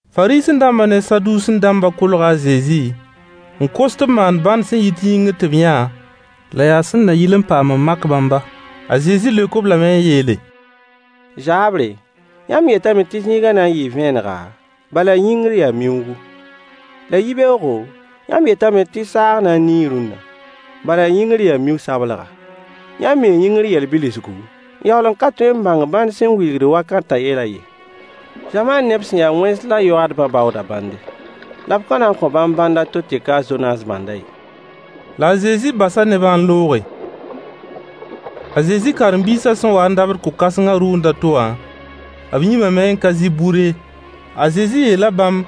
Fariisẽ-dãmbã ne Saduusẽ-dãmbã kolga a Zezi n kos tɩ b maan bãnd sẽn yit yĩngr tɩ b yã, la yaa sẽn na yɩl n paam n mak bãmba. A Zezi leok-b lame n yeele: Zaabre, yãmb yetame tɩ zĩigã na n yɩɩ vẽenega, bala yĩngr yaa miuugu. La yibeoogo, yãmb yetame tɩ saag na n nii rũnna, bala yĩngr yaa miu-sablga. Yãmb mii yĩngr yɛl bilsgu, n yaool n ka tõe n bãng bãn sẽn wilgd wakatã yɛlã ye. Zamaan neb sẽn ya wẽns la yoaadbã baooda bãnde. La b ka na n kõ bãmb bãnd a to tɩ ka a Zonaas bãndã ye. La a Zezi basa nebã n looge. A Zezi karen-biisã sẽn wa n dabd ko-kãsengã rʋʋnd a to wã, b yĩmame n ka zɩ bur ye. A Zezi yeela bãmb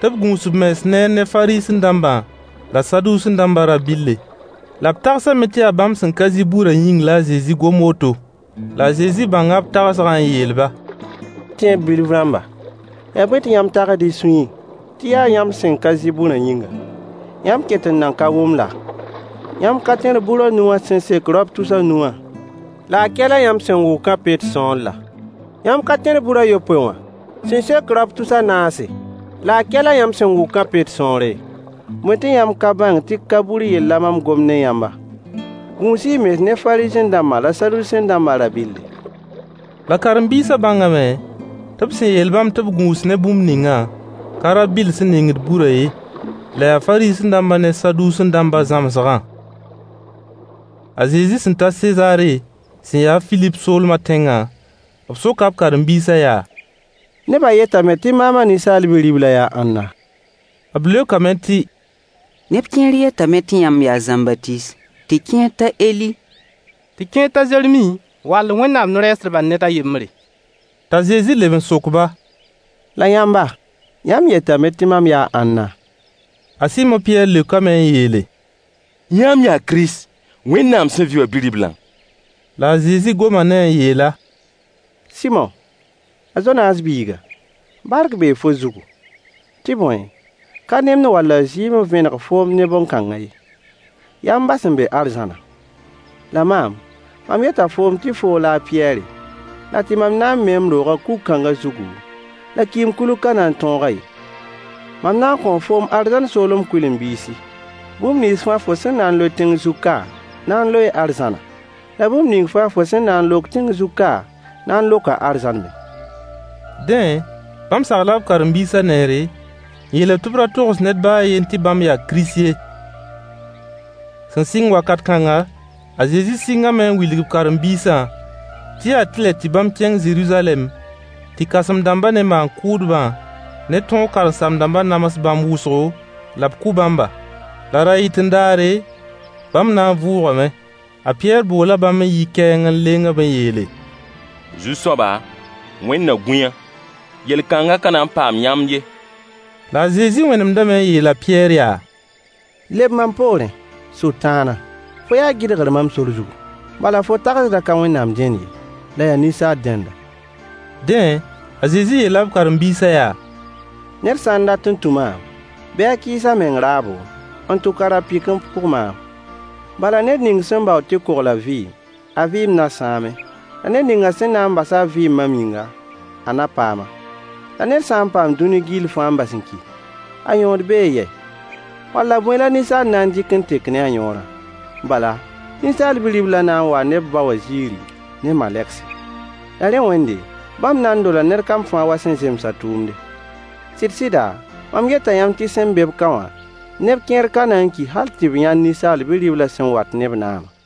tɩ b gũus b mens neer ne Fariisẽ-dãmbã la Saduusẽ-dãmbã rã-bɩlle. La b tagsame tɩ yaa bãmb sẽn ka zɩ burã yĩng la a Zezi gom woto. La a Zezi bãnga b tagsgã n yeel-ba: Tẽeb bilf rãmba! Yaa bõe tɩ yãmb tagsd y suyẽ tɩ yaa yãmb sẽn ka zɩ burã yĩnga? Yãmb ket n nan ka wʋm laa? Yãmb ka tẽr bur a nu wã sẽn sek raop tus a nu wã, la a kɛlã yãmb sẽn wʋkã pet sõor laa? Yãmb ka tẽr bur a yopoe wã sẽn sek raop tus a naase, la a kɛlã yãmb sẽn wʋkã pet sõore? Bõe tɩ yãmb ka bãng tɩ ka bur yell la mam gomd ne yãmba? Gũus-y y mens ne Fariisẽ-dãmbã la Saduusẽ-dãmbã rã-bɩlle. La karen-biisã bãngame tɩ b sẽn yeel bãmb tɩ b gũus ne bũmb ningã, ka rã-bɩll sẽn ningd burã ye, la yaa Fariisẽ-dãmbã ne Saduusẽ-dãmbã zãmsgã. A Zezi sẽn ta Sezaare sẽn ya a Filip soolmã tẽngã, b soka b karen-biisã yaa: Nebã yetame tɩ maam a Ninsaal Bi-riblã yaa ãnna? B leokame tɩ: Neb kẽer yetame tɩ yãmb yaa a Zãmbatiis, tɩ kẽer t'a Eli, tɩ kẽer t'a Zeremi wall Wẽnnaam no-rɛɛsdbã ned a yembre. T'a Zezi leb n sok-ba: La yãmba, yãmb yetame tɩ mam yaa ãnna? A Sɩmo Pɩyɛɛr leokame n yeele: Yãmb yaa Kirist, Wẽnnaam sẽn vɩ wã Bi-riblã La Zezi goma ne-a n yeel-a: Sɩmo! A Zonaas biiga, bark bee fo zugu. Tɩ bõe, ka nemd walla zɩɩm n vẽneg foom ne bõn-kãngã ye. Yaa m ba sẽn be arzãnã. La maam, mam yeta foom tɩ foo la a Pɩyɛɛre, la tɩ mam na n mee m roogã kug-kãngã zugu, la kɩɩm-kulg ka na n tõog-a ye. Mam na n kõo foom arzãn soolem kʋɩlen-biisi: Bũmb nins fãa fo sẽn na n loe tẽng zug ka na n loee arzãna, la bũmb ning fãa fo sẽn na n lok tẽng zug ka na n loka arzãn me. Dẽ, bãmb sagla b karen-biisã neere, n yeel-b tɩ b ra togs ned baa a yen tɩ bãmb yaa Kirist ye. Sẽn sɩng wakat kãnga, a Zezi sɩngame n wilg b karen-biisã tɩ yaa tɩlɛ tɩ bãmb kẽng Zeruzalɛm tɩ kãsem-dãmbã ne maan-kʋʋdbã ne tõog karen-saam-dãmbã nams bãmb wʋsgo, la b kʋ bãmba. La ra-yɩt-n-daare, bãmb na n vʋʋgame. A Pɩyɛɛr boola bãmb n yi kɛɛng n leng-b n yeele: Zu-soaba, Wẽnd na gũ-yã! Yel-kãngã ka na n paam yãmb ye. La a Zezi wẽnemdame n yeel a Pɩyɛɛr yaa: Leb mam poorẽ, Sʋtãana! Fo yaa gɩdgr mam sor zugu. Bala fo tagsdã ka Wẽnnaam dẽnd ye, la yaa ninsaal dẽnda. Dẽ, a Zezi yeela b karen-biisã yaa: Ned sã n dat n tũ maam, bɩ a kɩɩs a meng raabo, n tʋk a ra-pɩk n pʋg maam. Bala ned ning sẽn baood tɩ kogl a vɩɩm, a vɩɩm na sãame, la ned ning sẽn na n bas a vɩɩm mam yĩnga, a na paam-a. La ned sã n paam dũni gill fãa n bas n ki, a yõod bee yɛ? Walla bõe la ninsaal na n dɩk n tek ne a yõorã? Bala, Ninsaal Bi-riblã na n waa ne b ba wã ziiri, ne malegse. La rẽ wẽnde, bãmb na n dola ned kam fãa wa sẽn zems a tʋʋmde. Sɩd-sɩda, mam yeta yãmb tɩ sẽn be-b ka wã, neb kẽer n ka na n ki hal tɩ b yãnd Ninsaal Bi-riblã sẽn wat ne b naamã.